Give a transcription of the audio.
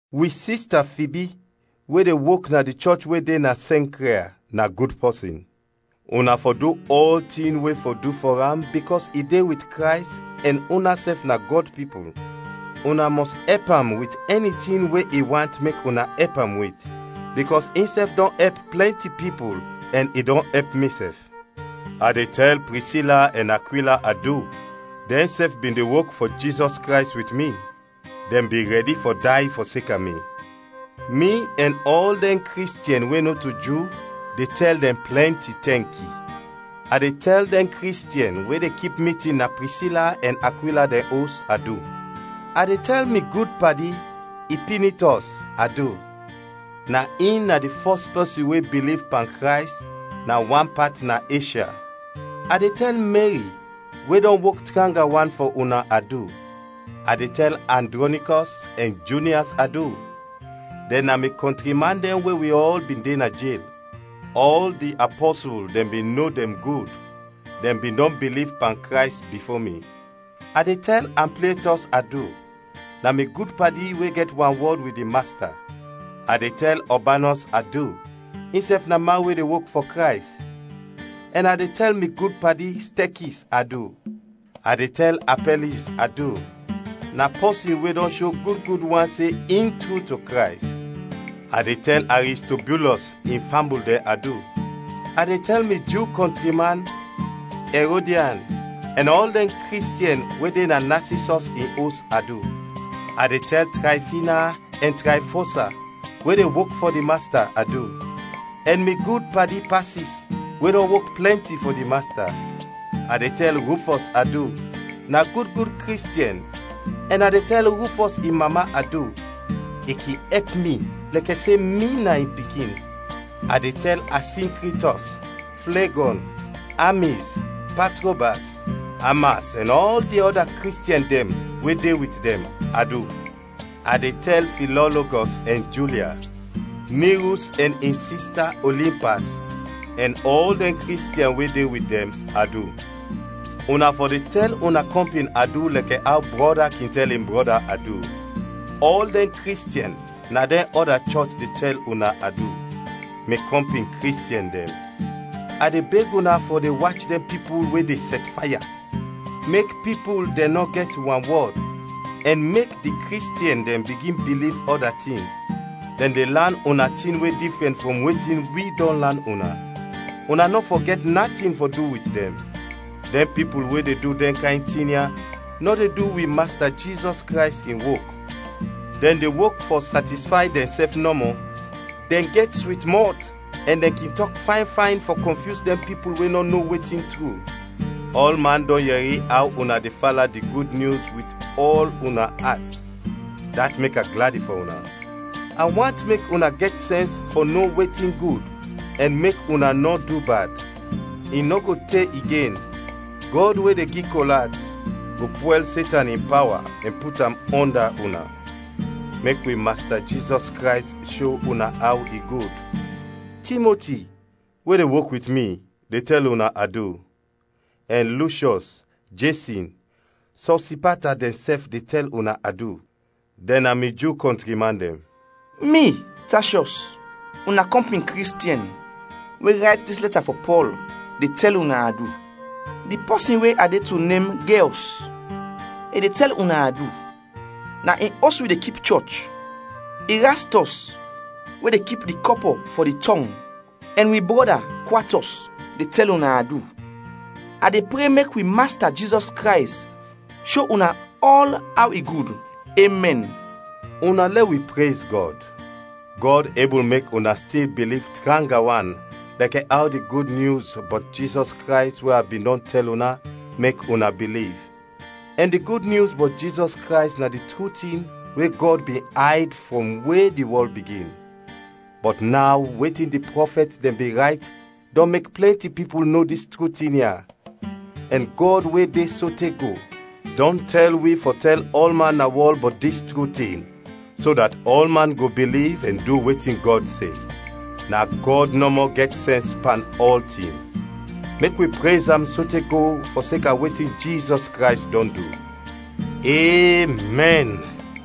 Wi sista Fibi we de wok na di chɔch we de na Sɛnkria, na gud pɔsin. Una fɔ du ɔltin we fɔ du fɔ am bikɔs i de wit Krays ɛn unasɛf na Gɔd pipul. Una mɔs ɛp am wit ɛni tin we i want mek una ɛp am wit, bikɔs insɛf dɔn ɛp plɛnti pipul ɛn i dɔn ɛp misɛf. A de tɛl Prisila ɛn Akwila adu, dɛnsɛf bin de wok fɔ Jizɔs Krays wit mi; dɛn bin rɛdi fɔ day fɔseka mi. Mi ɛn ɔl dɛn Kristiɛn we nɔto Ju de tɛl dɛn plɛnti tɛnki. A de tɛl dɛn Kristiɛn we de kip mitin na Prisila ɛn Akwila dɛn os, adu. A de tɛl mi gud padi, Ipinitɔs, adu, na in na di fɔs pɔsin we biliv pan Krays na wan pat na Eshya. A de tɛl Meri, we dɔn wok tranga wan fɔ una, adu. A de tɛl Andrɔnikɔs ɛn Junias adu, dɛn na mi kɔntri man dɛn we wi ɔl bin de na jel; ɔl di apɔsul dɛn bin no dɛn gud, dɛn bin dɔn biliv pan Krays bifo mi. A de tɛl Amplietɔs adu, na mi gud padi we gɛt wanwɔd wit di Masta. A de tɛl Ɔbanɔs adu, insɛf na man we de wok fɔ Krays; ɛn a de tɛl mi gud padi, Stekis, adu. A de tɛl Apɛliz adu, na pɔsin we dɔn sho gud gud wan se in tru to Krays. A de tɛl Aristobulɔs in fambul dɛn adu. A de tɛl mi Ju kɔntri man, Ɛrodian, ɛn ɔl dɛn Kristiɛn we de na Nasisɔs in os, adu. A de tɛl Trayfina ɛn Trayfosa, we de wok fɔ di Masta, adu; ɛn mi gud padi Pasis, we dɔn wok plɛnti fɔ di Masta. A de tɛl Rufɔs adu, na gud gud Kristiɛn, ɛn a de tɛl Rufɔs in mama adu, i kin ɛp mi lɛkɛ se mi na in pikin. A de tɛl Asinkritɔs, Flegɔn, Amiz, Patrobas, Amas ɛn ɔl di ɔda Kristiɛn dɛn we de wit dɛn, adu. A de tɛl Filɔlogɔs ɛn Julia, Nirus ɛn in sista, Olimpas, ɛn ɔl dɛn Kristiɛn we de wit dɛn, adu. Una fɔ de tɛl una kɔmpin adu lɛkɛ aw brɔda kin tɛl in brɔda adu. Ɔl dɛn Kristiɛn na dɛn ɔda chɔch de tɛl una adu. Mi kɔmpin Kristiɛn dɛn, a de beg una fɔ de wach dɛn pipul we de sɛtfaya, mek pipul dɛn nɔ gɛt wanwɔd, ɛn mek di Kristiɛn dɛn bigin biliv ɔda tin. Dɛn de lan una tin we difrɛn frɔm wetin wi dɔn lan una; una nɔ fɔ gɛt natin fɔ du wit dɛn. Dɛn pipul we de du dɛn kayn tin ya nɔ de du wi Masta Jizɔs Krays in wok, dɛn de wok fɔ satisfay dɛnsɛf nɔmɔ. Dɛn gɛt swit mɔt ɛn dɛn kin tɔk fayn fayn fɔ kɔnfyus dɛn pipul we nɔ no wetin tru. Ɔlman dɔn yɛri aw una de fala di Gud Nyus wit ɔl una at, dat mek a gladi fɔ una. A want mek una gɛt sɛns fɔ no wetin gud ɛn mek una nɔ du bad. I nɔ go te igen Gɔd we de gi kol at, go pwɛl Setan in pawa ɛn put am ɔnda una. Mek wi Masta Jizɔs Krays sho una aw i gud. Timoti, we de wok wit mi, de tɛl una adu; ɛn Lushyɔs, Jesɔn, Sosipata dɛnsɛf de tɛl una adu, dɛn na mi Ju kɔntri man dɛn. Mi, Tashiɔs, una kɔmpin Kristiɛn, we rayt dis lɛta fɔ Pɔl, de tɛl una adu. Di pɔsin we a de to nem Geyɔs, i de tɛl una adu. Na in os wi de kip chɔch; Irastɔs, we de kip di kɔpɔ fɔ di tɔng, ɛn wi brɔda Kwatɔs de tɛl una adu. [ A de pre mek wi Masta Jizɔs Krays sho una ɔl aw i gud. Emɛn.] Una lɛ wi prez Gɔd! Gɔd ebul mek una stil biliv tranga wan lɛkɛ aw di Gud Nyus bɔt Jizɔs Krays we a bin dɔn tɛl una mek una biliv; ɛn di Gud Nyus bɔt Jizɔs Krays na di tru tin we Gɔd bin ayd frɔm we di wɔl bigin. Bɔt naw wetin di prɔfɛt dɛn bin rayt dɔn mek plɛnti pipul no dis tru tin ya, ɛn Gɔd we de sote go, dɔn tɛl wi fɔ tɛl ɔlman na wɔl bɔt dis tru tin, so dat ɔlman go biliv ɛn du wetin Gɔd se. Na Gɔd nɔmɔ gɛt sɛns pan ɔltin; mek wi prez am sote go fɔseka wetin Jizɔs Krays dɔn du. Emɛn.